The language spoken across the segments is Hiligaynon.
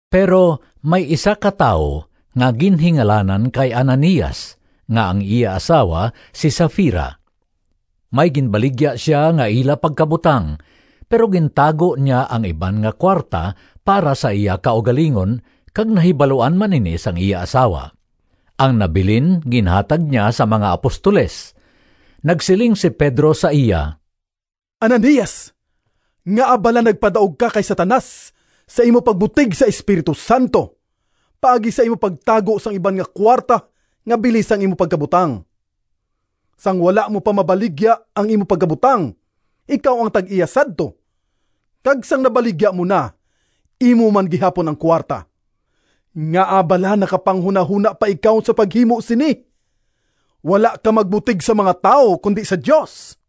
Pero may isa ka tawo nga ginhingalanan kay Ananias nga ang iya asawa si Safira. May ginbaligya sia nga ila pagkabutang, pero gintago niya ang iban nga kuwarta para sa iya kaugalingon kag nahibaluan man ini sang iya asawa. Ang nabilin ginhatag niya sa mga apostoles. Nagsiling si Pedro sa iya, “Ananias, ngaa bala nagpadaog ka kay Satanas sa imo pagbutig sa Espiritu Santo paagi sa imo pagtago sang iban nga kuwarta nga bili sang imo pagkabutang? Sang wala mo pa mabaligya ang imo pagkabutang ikaw ang tag-iya sadto, kag sang nabaligya mo na, imo man gihapon ang kuwarta. Ngaa bala nakapanghunahona pa ikaw sa paghimo sini? Wala ka magbutig sa mga tawo, kundi sa Dios!”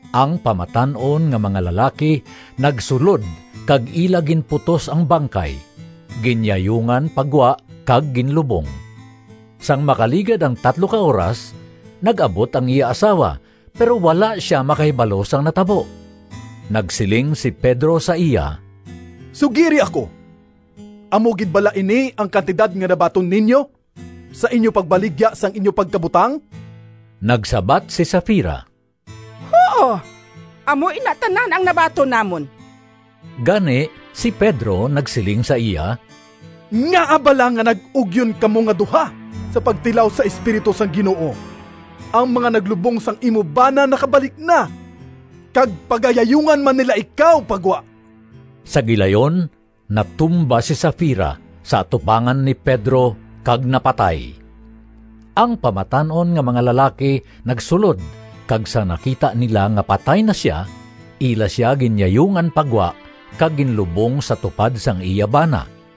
Ang pamatan-on nga mga lalaki nagsulod kag ila ginputos ang bangkay, ginyayungan pa gwa kag ginlubong. Sang makaligad ang tatlo ka oras, nag-abot ang iya asawa, pero wala sia makahibalo sang natabo. Nagsiling si Pedro sa iya, “Sugiri ako, amo gid bala ini ang kantidad nga nabaton ninyo sa inyo pagbaligya sang inyo pagkabutang?” Nagsabat si Safira, “Huo, amo ina tanan ang nabaton namon.” Gani si Pedro nagsiling sa iya, “Ngaa bala nga nag-ugyon kamo nga duha sa pagtilaw sa Espiritu sang Ginoo? Ang mga naglubong sang imo bana nakabalik na kag pagayayungan man nila ikaw pa gwa!” Sa gilayon natumba si Safira sa atubangan ni Pedro kag napatay. Ang pamatan-on nga mga lalaki nagsulod, kag sang nakita nila nga patay na sia, ila sia ginyayungan pa gwa kag ginlubong sa tupad sang iya bana.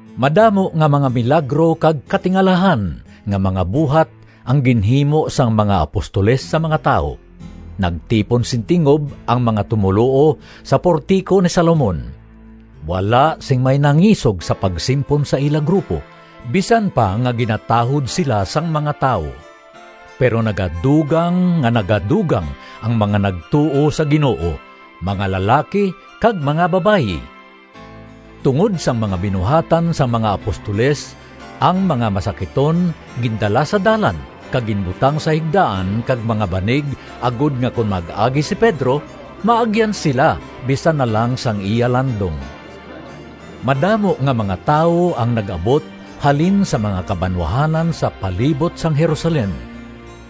Madamo nga mga milagro kag katingalahan nga mga buhat ang ginhimo sang mga apostoles sa mga tawo. Nagtipon sing tingob ang mga tumoluo sa Portico ni Salomon. Wala sing may nangisog sa pagsimpon sa ila grupo, bisan pa nga ginatahod sila sang mga tawo. Pero nagadugang nga nagadugang ang mga nagtuo sa Ginoo, mga lalaki kag mga babayi. Tungod sang mga binuhatan sang mga apostoles, ang mga masakiton gindala sa dalan kag ginbutang sa higdaan kag mga banig agod nga kon mag-agi si Pedro maagyan sila bisan na lang sang iya landong. Madamo nga mga tawo ang nag-abot halin sa mga kabanwahanan sa palibot sang Jerusalem.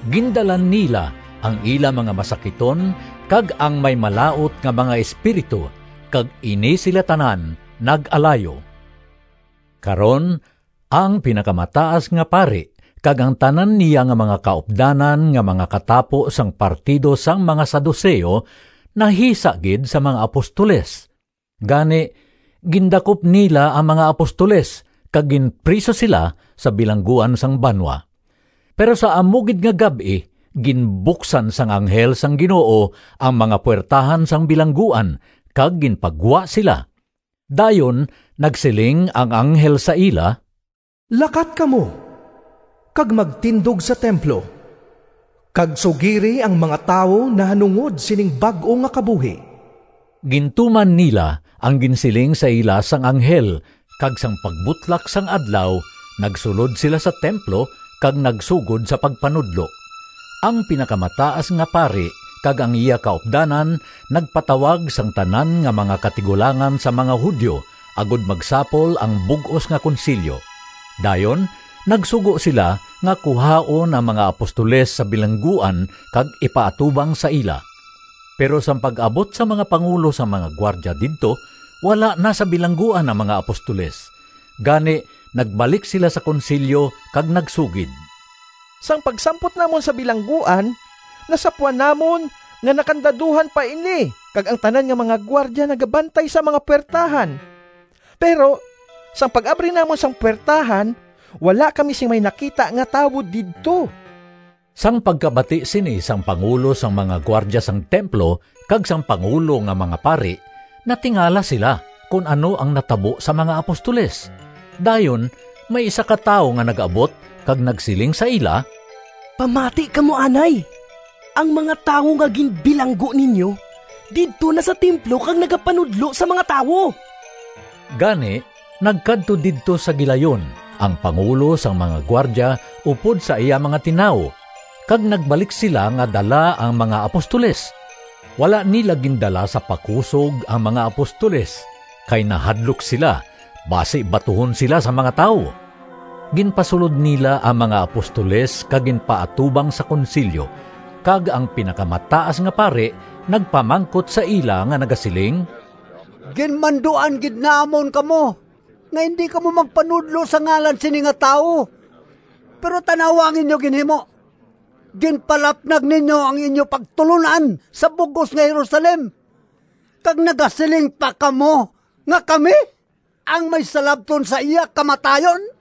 Gindala nila ang ila mga masakiton kag ang may malaut nga mga espiritu kag ini sila tanan nag-alayo. Karon ang Pinakamataas nga Pari kag ang tanan niya nga mga kaupdanan nga mga katapo sang partido sang mga Saduceo nahisa gid sa mga apostoles. Gani gindakop nila ang mga apostoles kag ginpriso sila sa bilangguan sang banwa. Pero sa amo gid nga gab-i ginbuksan sang anghel sang Ginoo ang mga puwertahan sang bilangguan, kag ginpagwa sila. Dayon nagsiling ang anghel sa ila, “Lakat kamo kag magtindog sa templo, kag sugiri ang mga tawo nahanungod sining bag-o nga kabuhi.” Gintuman nila ang ginsiling sa ila sang anghel kag sang pagbutlak sang adlaw nagsulod sila sa templo kag nagsugod sa pagpanudlo. Ang Pinakamataas nga Pari kag ang iya kaupdanan nagpatawag sang tanan nga mga katigulangan sang mga Judio agod magsapol ang bug-os nga Konsilyo. Dayon nagsugo sila nga kuhaon ang mga apostoles sa bilangguan kag ipaatubang sa ila. Pero sang pag-abot sang mga pangulo sang mga gwardya didto, wala na sa bilangguan ang mga apostoles. Gani nagbalik sila sa Konsilyo kag nagsugid, “Sang pagsampot namon sa bilangguan, nasapwan namon nga nakandaduhan pa ini kag ang tanan nga mga gwardya nagabantay sa mga puwertahan, pero sang pag-abri namon sang puwertahan wala kami sing may nakita nga tawo didto!” Sang pagkabati sini sang pangulo sang mga gwardya sang templo kag sang pangulo nga mga pari, natingala sila kon ano ang natabo sa mga apostoles. Dayon may isa ka tawo nga nag-abot kag nagsiling sa ila, “Pamati kamo anay, ang mga tawo nga ginbilanggo ninyo, didto na sa templo kag nagapanudlo sa mga tawo!” Gani nagkadto didto sa gilayon ang pangulo sang mga gwardya upod sa iya mga tinawo kag nagbalik sila nga dala ang mga apostoles. Wala nila gindala sa pakusog ang mga apostoles kay nahadlok sila basi batuhon sila sang mga tawo. Ginpasulod nila ang mga apostoles kag ginpaatubang sa Konsilyo, kag ang Pinakamataas nga Pari nagpamangkot sa ila nga nagasiling, “Ginmanduan gid namon kamo nga indi kamo magpanudlo sa ngalan sini nga tawo, pero tan-awa ang inyo ginhimo! Ginpalapnag ninyo ang inyo pagtulon-an sa bug-os nga Jerusalem kag nagasiling pa kamo nga kami ang may salabton sa iya kamatayon!”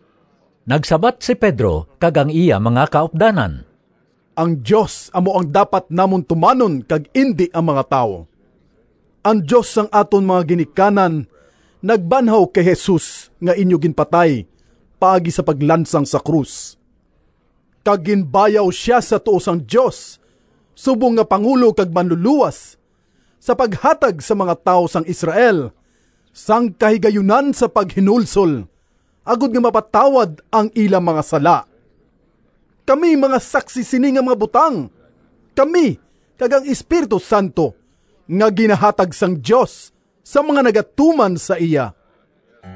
Nagsabat si Pedro kag ang iya mga kaupdanan, “Ang Dios amo ang dapat namon tumanon kag indi ang mga tawo. Ang Dios sang aton mga ginikanan nagbanhaw kay Jesus nga inyo ginpatay paagi sa paglansang sa krus. Kag ginbayaw sia sa tuo sang Dios subong nga Pangulo kag Manlulowas, sa paghatag sa mga tawo sang Israel sang kahigayunan sa paghinulsol agod nga mapatawad ang ila mga sala. Kami mga saksi sini nga mga butang—kami kag ang Espiritu Santo nga ginahatag sang Dios sa mga nagatuman sa iya.”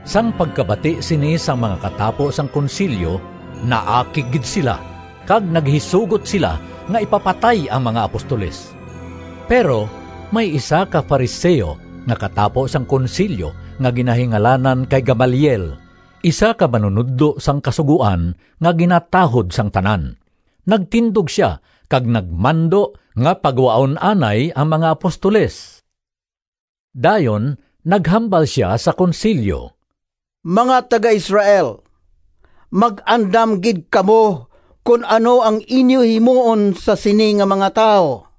Sang pagkabati sini sang mga katapo sang Konsilyo, naakig gid sila, kag naghisugot sila nga ipapatay ang mga apostoles. Pero may isa ka Fariseo nga katapo sang Konsilyo nga ginahingalanan kay Gamaliel, isa ka manunodlo sang Kasugoan nga ginatahod sang tanan. Nagtindog sia kag nagmando nga pagwaon anay ang mga apostoles. Dayon naghambal sia sa Konsilyo, “Mga taga-Israel, mag-andam gid kamo kon ano ang inyo himuon sa sini nga mga tawo.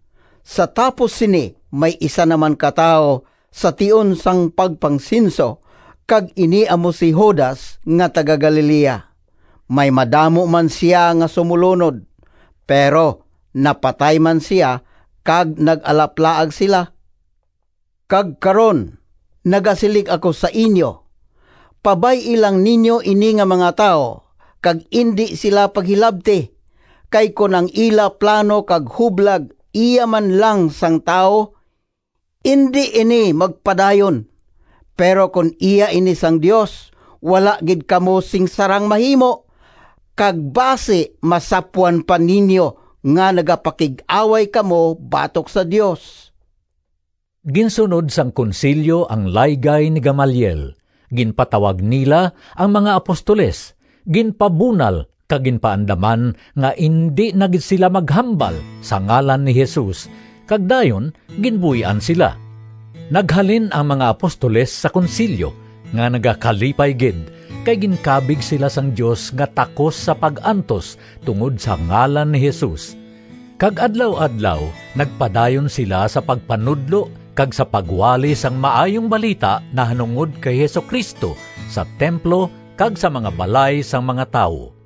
Sa tapos sini may isa na man ka tawo sa tion sang pagpangsenso, kag ini amo si Judas nga taga-Galilea. May madamo man sia nga sumolunod pero napatay man sia kag nag-alaplaag sila. Kag karon, nagasiling ako sa inyo, pabay-i lang ninyo ini nga mga tawo kag indi sila paghilabti, kay kon ang ila plano kag hublag iya man lang sang tawo, indi ini magpadayon. Pero kon iya ini sang Dios, wala gid kamo sing sarang mahimo, kag basi masapwan pa ninyo nga nagapakig-away kamo batok sa Dios!” Ginsunod sang Konsilyo ang laygay ni Gamaliel. Ginpatawag nila ang mga apostoles, ginpabunal kag ginpaandaman nga indi na gid sila maghambal sa ngalan ni Jesus, kag dayon ginbuy-an sila. Naghalin ang mga apostoles sa Konsilyo nga nagakalipay gid, kay ginkabig sila sang Dios nga takos sa pag-antos tungod sa ngalan ni Jesus. Kag adlaw-adlaw nagpadayon sila sa pagpanudlo kag sa pagwali sang Maayong Balita nahanungod kay Jesu-Cristo sa templo kag sa mga balay sang mga tawo.